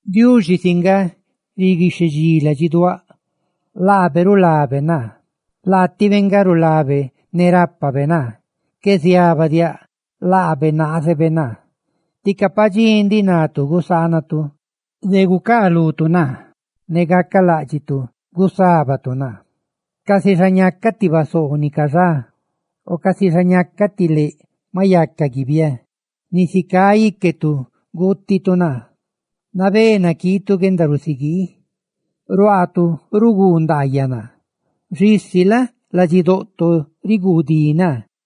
Diuxi si nga riguixhedxí ladxiduáꞌ; laabe rulabe naa. Laatibe nga rulabe ne rápabe naa. Qué ziabadiáꞌ, laabe naazebe naa. Tica padxí ndiꞌ natu gusaanatu de gucaalutu naa, ne gacaláꞌdxitu gusábatu naa, casi xa ñacaꞌ ti basoo ni cayaba ntaa o casi xa ñacaꞌ ti leꞌ maꞌ yaca guiaba layú. Nisi cá íquetu guutitu naa; nabé naquiitu guendarusiguii. Ruaatu ruguu ndaayaꞌ naa, xisi la? riguudí naa lu xquendabiaanitu.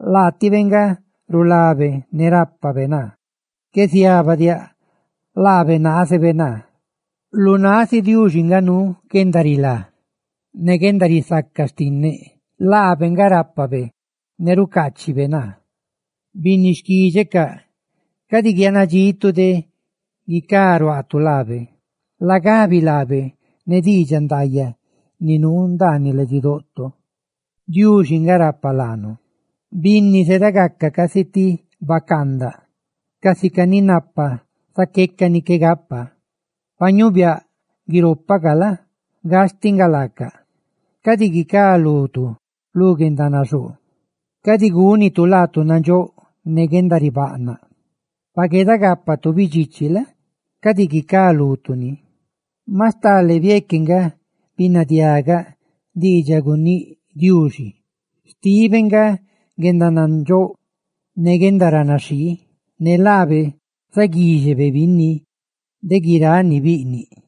Laatibe nga rulabe ne rápabe naa. Qué ziabadiáꞌ, laabe naazebe naa. Lu náꞌ si Diuxi nga nuu guendarilá ne guendarisaca xtinneꞌ; laabe nga rápabe naa ne ra nuube rucaacheluaꞌ. ¡Binni xquídxecaꞌ, cadi guiaanadxitu de guicá ruaatu laabe! ¡Lagabi laabe ne diidxaꞌ ndaayaꞌ ni nuu ndaaniꞌ ladxidoꞌto! ¡Diuxi nga rapa laanu! Binni zedagaca casi ti bacaandaꞌ, casica ni napa zaqueca ni qué gapa; pa ñuubiaꞌ guiropacaꞌ la? gastiꞌ nga laaca. Cadi guicá lutu lu guendanaxoo; ¡cadi gúnitu laatu nandxóꞌ ne guendaribaꞌnaꞌ! Pa gueedagápatu bidxichi la? cadi guicá lutu ni. Maꞌ stale bieque nga binadiaꞌgaꞌ diidxaꞌ guníꞌ Diuxi: xtibe nga guendanandxóꞌ ne guendaranaxhii, ne laabe zaguíxebe binni de guiráꞌ ni biꞌniꞌ.